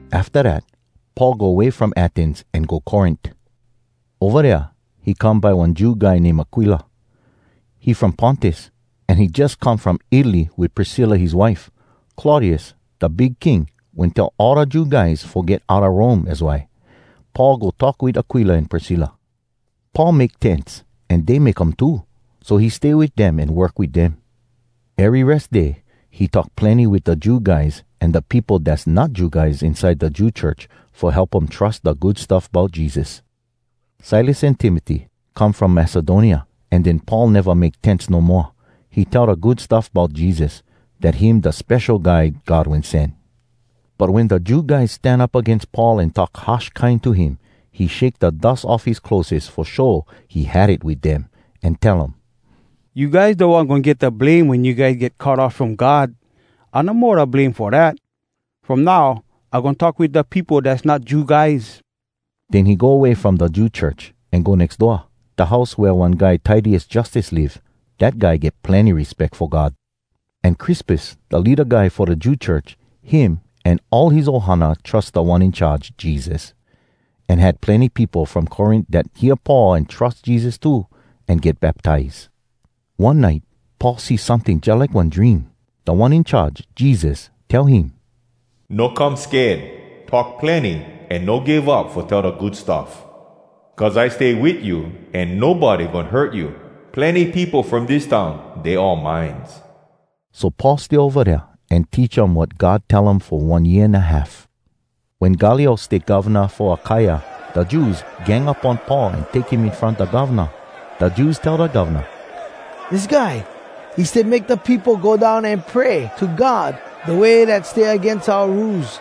Afta dat Paul go way from Athens an go Corint. Ova dea he come by one Jew guy name Aquila. He from Pontus, an he jus come from Italy wit Priscilla his wife. Claudius da Big King wen tell all da Jew guys fo get outa Rome az why. Paul go talk wit Aquila an Priscilla. Paul make tents an dey make um too, so he stay wit dem an work wit dem. Ery Res Day he talk plenny wit da Jew guys an da peopo dass not Jew guys inside da Jew church fo help um trus da Good Stuff Bout Jesus. Silas an Timoty come from Macedonia. An den Paul neva make tents no moa. He tell da Good Stuff Bout Jesus, dat him da Spesho Guy God Wen Sen. But wen da Jew guys stan up agains Paul an talk harsh kine to him, he shake da dus off his clotheses fo show he had it wit dem, an tell um, “You guys da one goin get da blame wen you guys get cut off from God! I no mo da blame fo dat. From now, I goin talk wit da peopo dass not Jew guys.” Den he go way from da Jew church, an go nex door, da house wea one guy Titius Justus live. Dat guy get plenny respeck fo God. An Crispus, da leada guy fo da Jew church, him an all his ohana trus Da One In Charge, Jesus. An had plenny peopo from Corint dat hear Paul an trus Jesus too, an get baptize. One nite Paul see someting jalike one dream. Da One In Charge, Jesus, tell him, “No come sked. Talk plenny, an no give up fo tell da Good Stuff. Cuz I stay wit you, an nobody goin hurt you. Plenny peopo from dis town, dey all mines.” So Paul stay ova dea an teach um wat God tell fo one year an a half. Wen Gallio stay govna fo Akaia, da Jews gang up on Paul an take him in front da govna. Da Jews tell da govna, “Dis guy, he stay make da peopo go down an pray to God da way dat stay agains oua Rules.”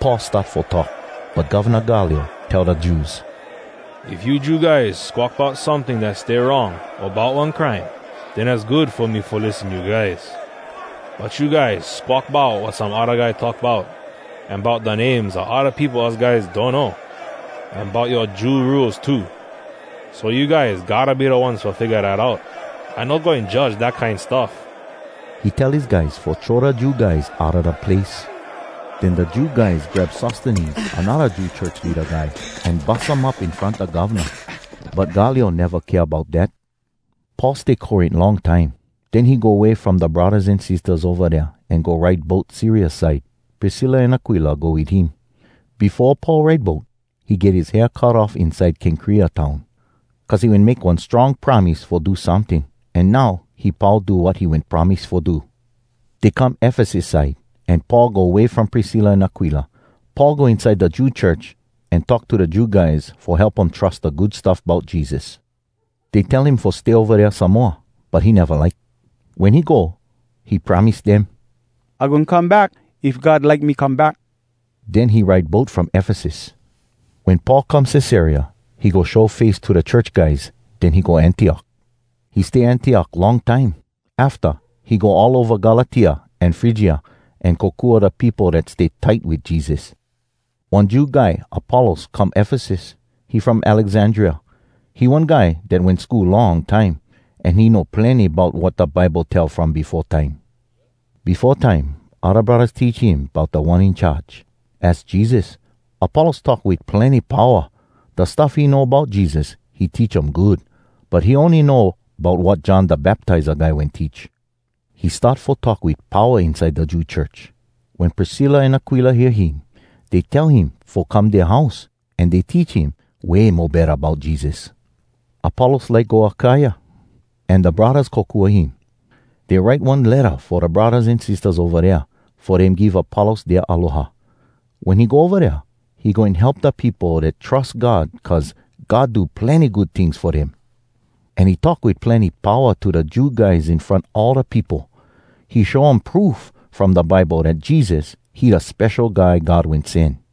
Paul start fo talk, but Govna Gallio tell da Jews, “If you Jew guys squawk bout someting dat stay wrong o bout one crime, den az good fo me fo lissen you guys. But you guys squawk bout wat some odda guy talk bout, an bout da names a odda peopo us guys donno, an bout yoa Jew rules too. So you guys gotta be da ones fo figga dat out. I no goin judge dat kine stuff.” He tell his guys fo throw da Jew guys outa da place. Den da Jew guys grab Sostenes, anodda Jew church leada guy, an bus um up in front da govna. But Gallio neva kea bout dat. Paul stay Corint long time. Den he go way from da braddahs an sistahs ova dea an go ride boat Syria side. Priscilla an Aquila go wit him. Befo Paul ride boat, he get his hair cut off inside Kenkrea town, cuz he wen make one strong promise fo do someting, an now he pau do wat he wen promise fo do. Dey come Efesus side, an Paul go way from Priscilla an Aquila. Paul go inside da Jew church, an talk to da Jew guys fo help um trus da Good Stuff Bout Jesus. Dey tell him fo stay ova dea some moa, but he neva like. Wen he go, he promise dem, “I goin come back if God like me come back.” Den he ride boat from Efesus. Wen Paul come Cesarea, he go show face to da church guys. Den he go Antiok. He stay Antiok long time. Afta, he go all ova Galatia an Frygia, an kokua da peopo dat stay tight wit Jesus. One Jew guy Apollos come Efesus. He from Alexandria. He one guy dat wen go school long time, an he know plenny bout wat da Bible tell from befo time. Befo time odda braddahs teach him bout Da One In Charge, az Jesus. Apollos talk wit plenny powa. Da stuff he know bout Jesus, he teach um good. But he ony know bout wat John Da Baptiza Guy wen teach. He start fo talk wit powa inside da Jew church. Wen Priscilla an Aquila hear him, dey tell him fo come dea house. An dey teach him way mo betta bout Jesus. Apollos like go Akaia, an da braddahs kokua him. Dey write one letta fo da braddahs an sistahs ova dea, fo dem give Apollos dea aloha. Wen he go ova dea, he goin help da peopo dat trus God cuz God do plenny good tings fo dem. An he talk wit plenny powa to da Jew guys in front all da peopo. He show um proof from da Bible dat Jesus, he da Spesho Guy God Wen Sen.